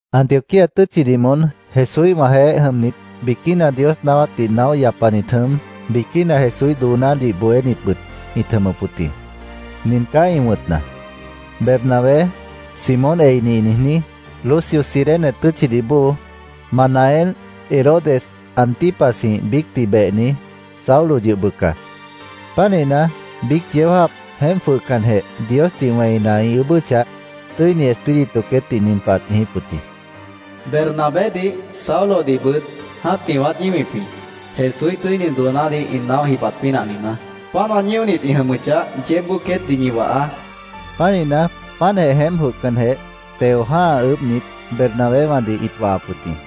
Antioquía tʉ́tchidih moón Jesúíhwãjeéh jʉmnit, biquína Dios naáwátdih naóh yapanit jʉm, biquína Jesúíh doonádih bohénitbʉt ĩt jʉmʉp wʉt jĩ. Nin caá ĩ wʉ̃tna: Bernabé, Simón Eini ĩ niijní, Lucio Cirene tʉ́tchidih bóo, Manaén Herodes Antipasjĩh biícdih behni, Saulo yʉh bʉca. Pánihna, biíc yeó jáap jeémp jwʉhcanjeh, Diosdih wẽina, ĩ ʉʉ́bʉ́chah, Tʉ́ini Espíritu queétdih nin pah ãt niijíp wʉt jĩ: “Bernabédih, Saulodihbʉt jã́tih wãát ñíwip jĩ, Jesúíh tʉ́ini doonádih ĩ naóh jibat pínah niijná. Páant wã ñíonit ĩ jʉmʉchah, yeébboó queétdih ñi wahaá”, ãt niijíp wʉt jĩ. Pánihna, páantjeh jeémp jwʉhcanjeh, teo jã́ha ʉʉ́bhnit, Bernabéwãdih ĩt wahap wʉt jĩ.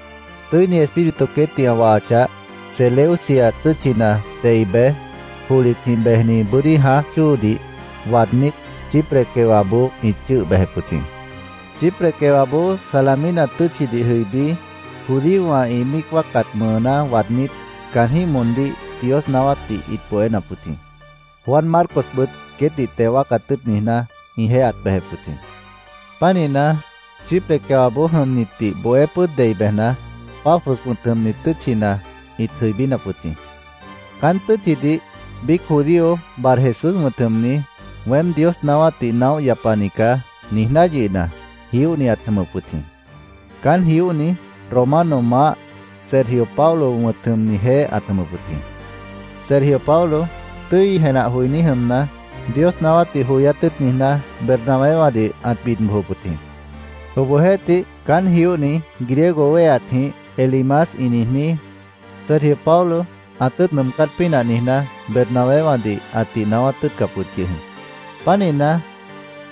Tʉ́ini Espíritu queétdih ã wahachah, Seleucia tʉ́tchina dei bej, johlitjĩh bejni bʉ́dí jãáj chóodih waadnít, Chipre quewaboó ĩt chʉ́ʉh bejep wʉt jĩ. Chipre quewaboó Salamina tʉ́tchidih jʉibí, judíowã ĩ míic wáacat mʉʉná waadnít, caanjĩ́h moondíh Dios naáwátdih ĩt bohénap wʉt jĩ. Juan Marcosbʉt queétdih teo wáacat tʉ́ʉt niijná, ĩjeéh ãt bejep wʉt jĩ. Pánihna, Chipre quewaboó jʉmnitdih bohé pʉ́ʉd dei bejna, Pafos wʉ̃t jʉmni tʉ́tchina ĩt jʉibínap wʉt jĩ. Caán tʉ́tchidih biíc judío Barjesús wʉ̃t jʉmni, “Weém Dios naáwátdih naóh yapani caá”, niijná yʉhna, jióhni ãt jʉmʉp wʉt jĩ. Caán jióhni Romano maáh Sergio Paulo wʉ̃t jʉmnijeéh ãt jʉmʉp wʉt jĩ. Sergio Paulo, tʉ́i jenah joiní jʉmna, Dios naáwátdih joyát tʉ́ʉt niijná, Bernabéwãdih ãt bid bojop wʉt jĩ. Obohjeéhtih, caán jióhni, griego wéheatjĩh Elimas ĩ niijní, Sergio Paulo ã tʉ́ʉt nʉʉmcát pínah niijná, Bernabéwãdih ãtih naáwát tʉ́ʉtcap wʉt yʉh jĩ. Pánihna,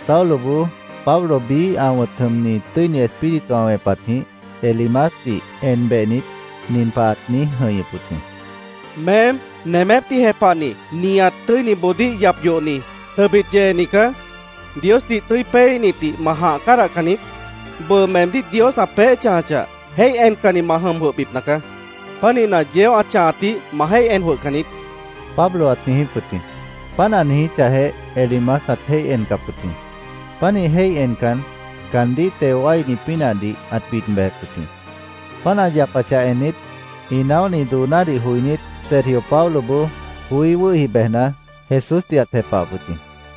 Sauloboó, Pablo biíh ã wʉ̃t jʉmni, Tʉ́ini Espíritu ã wẽpatjĩh Elimasdih en behnit, nin pah ãt niíj jʉ̃ihñʉp wʉt jĩ: —Meém, nemépdih jepahni, nihat tʉ́iniboodíh yap yohni, tʉbit yeeni caá. ¿Diosdih tʉ́i péeíhnitdih ma jãh cádahcan niít? Bʉʉ meemdíh Dios ã peéh chãjachah, jéih encanni ma jʉm jwʉhbipna caá. Pánihna, yeó ã chãhatdih ma jéih en jwʉhcan niít, Pablo ãt niijíp wʉt jĩ. Páant ã niijíchahjeh, Elimas ãt jéih encap wʉt jĩ. Pánih jéih encan, caandíh teo wáini pínahdih ãt bid bejep wʉt jĩ. Páant ã yapachah ennit, ĩ naóhni doonádih joinít, Sergio Pauloboó joí wʉ́hi bejna, Jesúsdih ãt jepahap wʉt jĩ.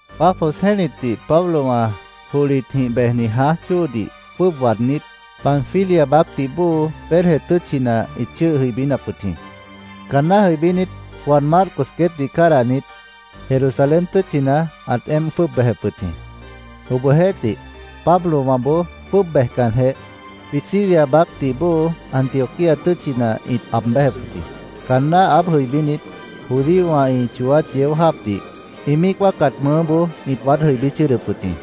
Pafos jẽ́litdih Pablowã johlitjĩh bejni jãáj chóodih jwʉ́ʉb waadnít, Panfilia baácdih bóo Perge tʉ́tchina ĩt chʉ́ʉh jʉibínap wʉt jĩ. Caanná jʉibínit, Juan Marcos queétdih cádahnit, Jerusalén tʉ́tchina ãt éemp jwʉ́ʉb bejep wʉt jĩ. Obohjeéhtih, Pablowãboó jwʉ́ʉb bejcanjeh, Pisidia baácdih bóo Antioquía tʉ́tchina ĩt aab béjep wʉt jĩ. Caanná aáb jʉibínit, judíowã ĩ chooát yeó jáapdih, ĩ míic wáacat mʉʉ́boó ĩt waád jʉibí chʉ́ʉdʉp wʉt jĩ.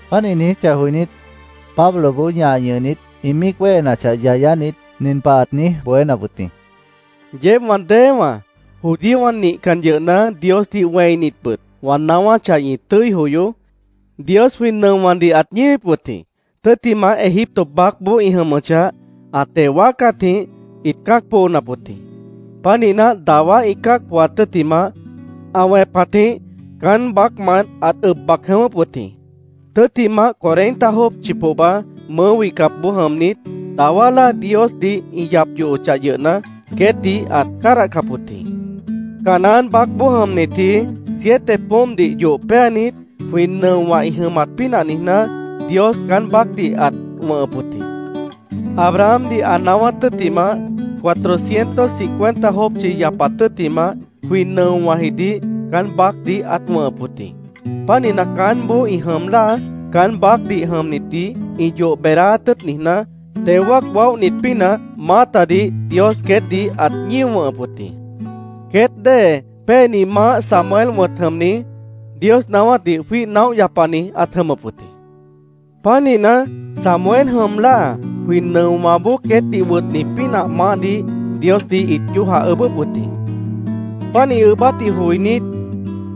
Páant ĩ niijíchah joinít, Pabloboó ñah ñʉhnit, ĩ míic wéhenachah yayánit, nin pah ãt niíj bohénap wʉt jĩ: —Yeéb wã déewãá, judíowã nihcannit yʉhna Diosdih wẽinitbʉt, wã naáwáchah, ñi tʉ́i joyoó. Dios jwĩ nʉowãdih ãt ñíwip wʉt jĩ. Tʉ́ttimah, Egipto baácboó ĩ jʉmʉchah, ã teo wáacatjĩh ĩt cã́ac poonap wʉt jĩ. Pánihna, dawá ĩ cã́ac pooat tʉ́ttimah, ã wẽpatjĩh caán baácmant ãt ʉb bac jʉ̃ʉ́wʉ́p wʉt jĩ. Tʉ́ttimah, cuarenta jópchi pohba mʉʉ́ wihcapboó jʉmnit, dawá láa Diosdih ĩ yap yohochah yʉhna, queétdih ãt cádahcap wʉt jĩ. Canaán baácboó jʉmnitji siete poómpdih yoh péanit, jwĩ nʉowã ĩ jʉmat pínah niijná, Dios caán baácdih ãt wʉ̃hʉp wʉt jĩ. Abrahamdih ã naáwát tʉ́ttimah, cuatrocientos cincuenta jópchi yapat tʉ́ttimah, jwĩ nʉowãjidih caán baácdih ãt wʉ̃hʉp wʉt jĩ. Pánihna, caánboó ĩ jʉm láa, caán baácdih jʉmnitdih ĩ yoh beedáát tʉ́ʉt niijná, teo wáac waóhnit pínah maátadih Dios queétdih ãt ñío wʉ̃hʉp wʉt jĩ. “Queét dée péeni maáh Samuel wʉ̃t jʉmni, Dios naáwátdih jwíih naóh yapani ãt jʉmʉp wʉt jĩ. Pánihna, Samuel jʉm láa, jwĩ nʉowãboó queétdih wʉtni pínah maáhdih Diosdih ĩt yójah ʉʉ́bʉ́p wʉt jĩ. Páant ĩ ʉʉ́bátdih joinít,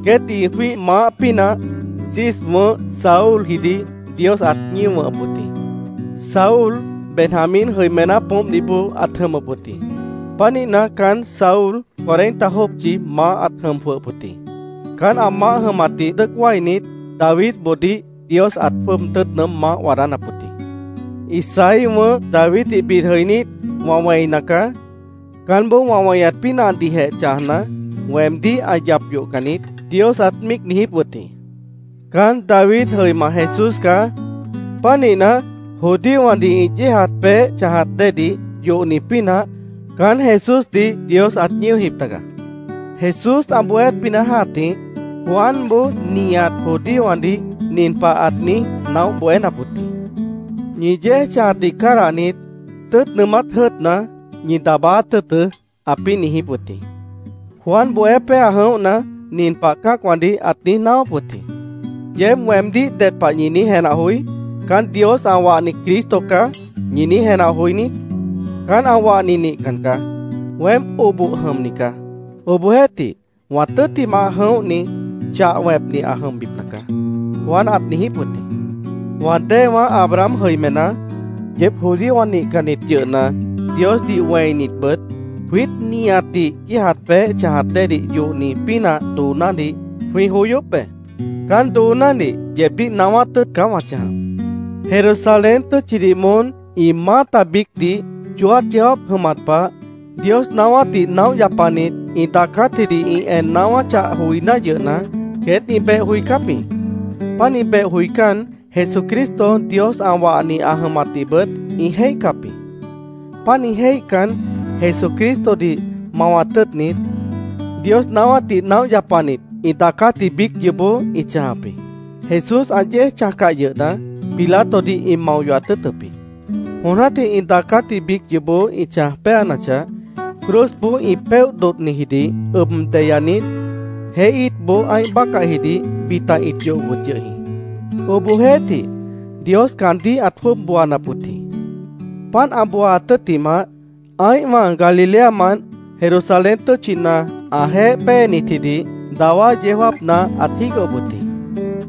queétdih ĩ jwíih maáh pínah Cis wʉ̃ʉ́h Saúljidih Dios ãt ñío wʉ̃hʉp wʉt jĩ. Saúl Benjamín jʉimená poómpdih bóo ãt jʉmʉp wʉt jĩ. Pánihna, caán Saúl cuarenta jópchi maáh ãt jʉm jwʉhʉp wʉt jĩ. Caán ã maáh jʉmatdih dʉ́ʉc wáinit, Davidboodíh Dios ãt jwʉ́ʉb tʉ́ʉt nʉʉ́m maáh waadánap wʉt jĩ. “Isaí wʉ̃ʉ́h Daviddih bid jʉinít, wã wẽina caá. Caánboó wã weñat pínahdihjeh chãjna, weemdíh ã yap yohcan niít”, Dios ãt míic niijíp wʉt jĩ. Caán David jʉima Jesús caá. Pánihna, judíowãdih ĩ yéejat peéh chãjat déedih yohni pínah caán Jesúsdih Dios ãt ñíojip taga. Jesús ã bohéát pínah jã́tih, Juanboó nihat judíowãdih nin pah ãt niíj naóh bohénap wʉt jĩ: ‘Ñi yéej chãjatdih cádahnit, tʉ́ʉt nʉʉmát jʉ́ʉtna, ñi daabáát tʉ́ʉtʉ́’, ãpĩ́ niijíp wʉt jĩ. Juan bohé péa jʉ̃óhna, nin pah cã́acwãdih ãt niíj naáwáp wʉt jĩ: ‘¿Yeéb weemdíh ded pah ñi niíj jenah joí? ¿“Caán Dios ã wahni Cristo caá”, ñi niíj jenah joí niít? Caán ã wahni nihcan caá. Weém oboh jʉmni caá. Obohjeéhtih, wã tʉ́ttimah jʉ̃óhni chah wẽpni ã jʉmbipna caá’, Juan ãt niijíp wʉt jĩ. “Wã déewã Abraham jʉimená, yeéb judíowã nihcannit yʉhna Diosdih wẽinitbʉt, jwiít nihatdih yéejat peéh chãjat déedih yohni pínah doonádih jwĩ joyóp be. Caán doonádih yeebdíh naáwát tʉ́ʉt caá wã chãjap. Jerusalén tʉ́tchidih moón, ĩ maáta biícdih, chooát yeó jáap jʉmat pah, Dios naáwátdih naóh yapanit ĩ daacátjidih ĩ en naáwáchah joiná yʉhna, queét ĩ beh joicáp jĩ. Pánih beh joicán, Jesucristo Dios ã wahni ã jʉmatdihbʉt ĩ jéihcap jĩ. Pánih jéihcan, Jesucristodih mawat tʉ́ʉtnit, Dios naáwátdih naóh yapanit ĩ daacátji biíc yoobó ĩ chãjap jĩ. Jesús ã yéej chãjcah yʉhna, Pilatodih ĩ mao yohat tʉ́ʉtʉp jĩ. Jon jã́tih ĩ daacátji biíc yoobó ĩ chãj péanachah, cruzboó ĩ péoh dodhnijidih ʉb deyanit, jeé íitboó ã́ih bácahjidih bita ĩt yohop wʉt yʉh jĩ. Obohjeéhtih, Dios caandíh ãt jwʉ́ʉb booanap wʉt jĩ. Páant ã booaat tʉ́ttimah, ã́ihwã Galileamant Jerusalén tʉ́tchina ãjeéh péenitjidih dawá yeó jáapna ãt jígohop wʉt jĩ.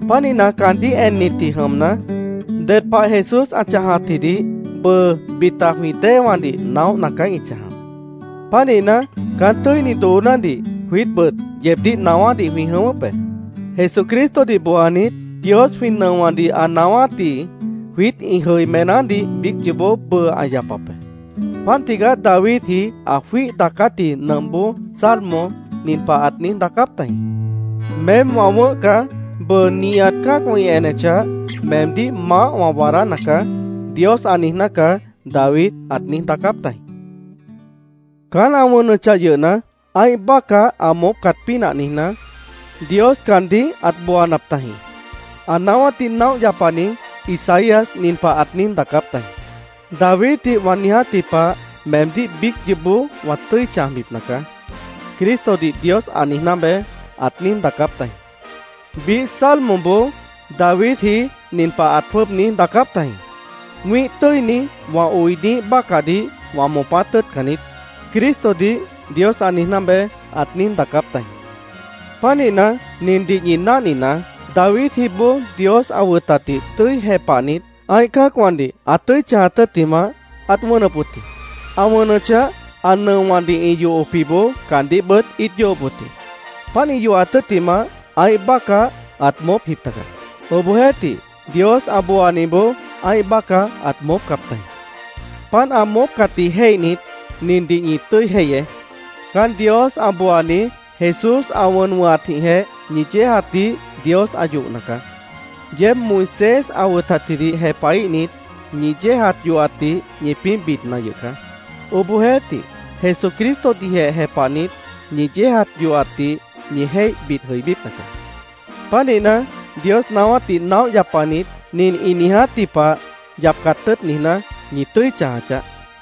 Pánihna, caandíh ennitji jʉmna, ded pah Jesús ã chãjatjidih bʉʉ bita jwĩ déewãdih naóhna caá ĩ chãjap. “Pánihna, caán tʉ́ini doonádih jwiítbʉt yeebdíh naáwádih jwĩ jʉ̃ʉ́wʉ́p be. Jesucristodih booanit, Dios jwĩ nʉowãdih ã naáwátji jwiít ĩ jʉimenádih biíc yoobó bʉʉ ã yapap be. Páant tigaá Davidji ã jwíih daacátji nʉmpboó Salmo nin pah ãt niíj daacáp tajĩ: ‘ “Meém wã wʉ̃ʉ́h caá. Bʉʉ nihat cã́acwã ĩ enechah, meemdíh maáh wã waadána caá”, Dios ã niijná caá’, David ãt niíj daacáp tajĩ. Caán ã wʉnʉchah yʉhna, ã́ih bácah ã moópcat pínah niijná, Dios caandíh ãt booanap tajĩ. Ã naáwátdih naóh yapani Isaías nin pah ãt niíj daacáp tajĩ: ‘ “Daviddih wã niijátji pah meemdíh biíc yoobó wã tʉ́i chãjbipna caá”, Cristodih Dios ã niijná beé’, ãt niíj daacáp tajĩ. Biíh Salmoboó Davidji nin pah ãt jwʉ́ʉb niíj daacáp tajĩ: ‘ “Wĩ́ih tʉ́ini, wã oiniíh bácahdih wã moopát tʉ́ʉtcan niít”, Cristodih Dios ã niijná beé’, ãt niíj daacáp tajĩ. Pánihna, nindih ñi náhninaá: Davidjiboó Dios ã wʉtatdih tʉ́i jepahnit, ã́ih cã́acwãdih ã tʉ́i chãjat tʉ́ttimah, ãt wʉnʉp wʉt jĩ. Ã wʉnʉchah, ã nʉowãdih ĩ yohopjiboó caandíhbʉt ĩt yohop wʉt jĩ. Páant ĩ yohat tʉ́ttimah, ã́ih bácah ãt moópjip taga. Obohjeéhtih, Dios ã booaniboó ã́ih bácah ãt moópcap tajĩ. Páant ã moópcatdih jéihnit, nindih ñi tʉ́i jéihyeé: Caán Dios ã booani Jesús ã wʉn wʉ̃hatjĩhjeh ñi yéejatdih Dios ã yohna caá. Yeéb Moisés ã wʉtatjidih jepahíhnit, ñi yéejat yohatdih ñipĩ́ bidna yʉh caá. Obohjeéhtih, Jesucristodihjeh jepahnit, ñi yéejat yohatdih ñi jéih bid jʉibípna caá. Pánihna, Dios naáwátdih naóh yapanit nin ĩ niijátji pah yapcat tʉ́ʉt niijná, ñi tʉ́i chãja chaáh.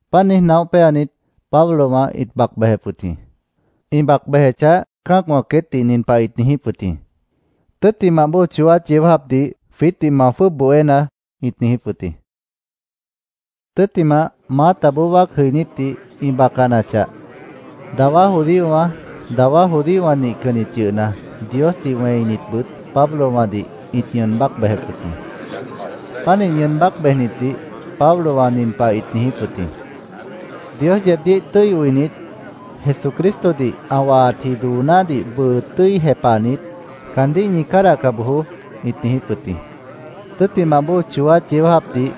Páant niíj naóh péanit, Pablowã ĩt bac bejep wʉt jĩ. Ĩ bac bejechah, cã́acwã queétdih nin pah ĩt niijíp wʉt jĩ: “Tʉ́ttimah bóo chooát yeó jáapdih jwiítdih ma jwʉ́ʉb bohénaá”, ĩt niijíp wʉt jĩ. Tʉ́ttimah, maátaboó wáac jʉinítdih ĩ bacanachah, dawá judíowã, dawá judíowã nihcannit yʉhna Diosdih wẽinitbʉt Pablowãdih ĩt ñʉʉn bác bejep wʉt jĩ. Pánih ñʉʉn bác bejnitdih Pablowã nin pah ĩt niijíp wʉt jĩ: “Dios yeebdíh tʉ́i oinit, Jesucristodih ã wahatji doonádih bʉʉ tʉ́i jepahnit, caandíh ñi cádahca bojoó”, ĩt niijíp wʉt jĩ. Tʉ́ttimah bóo chooát yeó jáapdih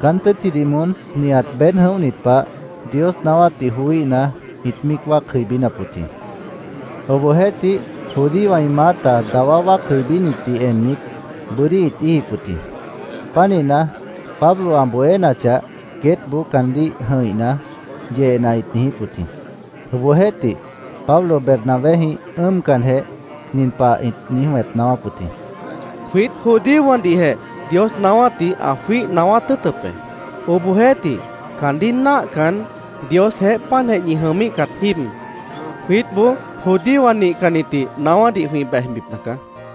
caán tʉ́tchidih moón nihat beéd jʉ̃óhnit pah Dios naáwátdih joííhna, ĩt míic wáac jʉibínap wʉt jĩ. Obohjeéhtih, judíowã ĩ maáta dawá wáac jʉibínitdih ennit, bʉ́dí ĩt íijip wʉt jĩ. Pánihna, Pablo ã bohénachah, queétboó caandíh jʉ̃ihna, yehna ĩt niijíp wʉt jĩ. Obohjeéhtih, Pablo Bernabéjĩh ʉ́ʉmcanjeh, nin pah ĩt niíj wẽp naáwáp wʉt jĩ: —Jwiít judíowãdihjeh Dios naáwátdih ã jwíih naáwát tʉ́ʉtʉp be. Obohjeéhtih, caandíh náahcan, Diosjeéh páantjeh ñi jʉmíhcat jíib, jwiítboó judíowã nihcannitdih naáwádih jwĩ bejbipna caá.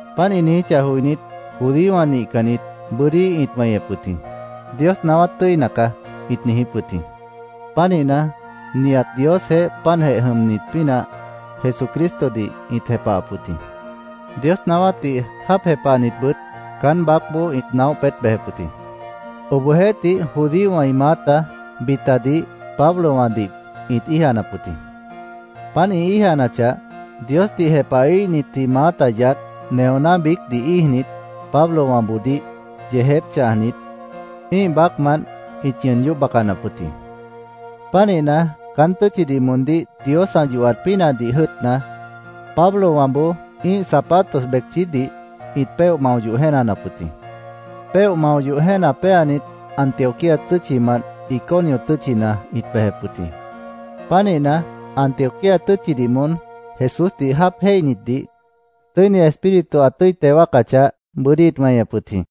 Páant ĩ niijíchah joinít, judíowã nihcannit bʉ́dí ĩt weñep wʉt jĩ. “Dios naáwát tʉ́ina caá”, ĩt niijíp wʉt jĩ. Pánihna, nihat Diosjeéh páantjeh jʉmnit pínah, Jesucristodih ĩt jepahap wʉt jĩ. Dios naáwátdih jáap jepahnitbʉt caán baácboó ĩt naóh peét bejep wʉt jĩ. Obohjeéhtih, judíowã ĩ maáta bitadih Pablowãdih ĩt íijanap wʉt jĩ. Páant ĩ íijanachah, Diosdih jepahíhnitji maáta yaádh, neoná biícdih íijnit, Pablowãboodíh yeejép chãjnit, ĩ́ih baácmant ĩt ñʉʉn yóh bacanap wʉt jĩ. Pánihna, caán tʉ́tchidih moondíh Dios ã yohat pínahdih jʉ́ʉtna, Pablowãboó ĩ́ih zapatos becchídih ĩt péoh mao yoh jéenanap wʉt jĩ. Péoh mao yoh jéena péanit, Antioquía tʉ́tchimant Iconio tʉ́tchina ĩt bejep wʉt jĩ. Pánihna, Antioquía tʉ́tchidih moón Jesúsdih jáap jéihnitdih Tʉ́ini Espíritu ã tʉ́i teo wáacachah, bʉ́dí ĩt weñep wʉt jĩ.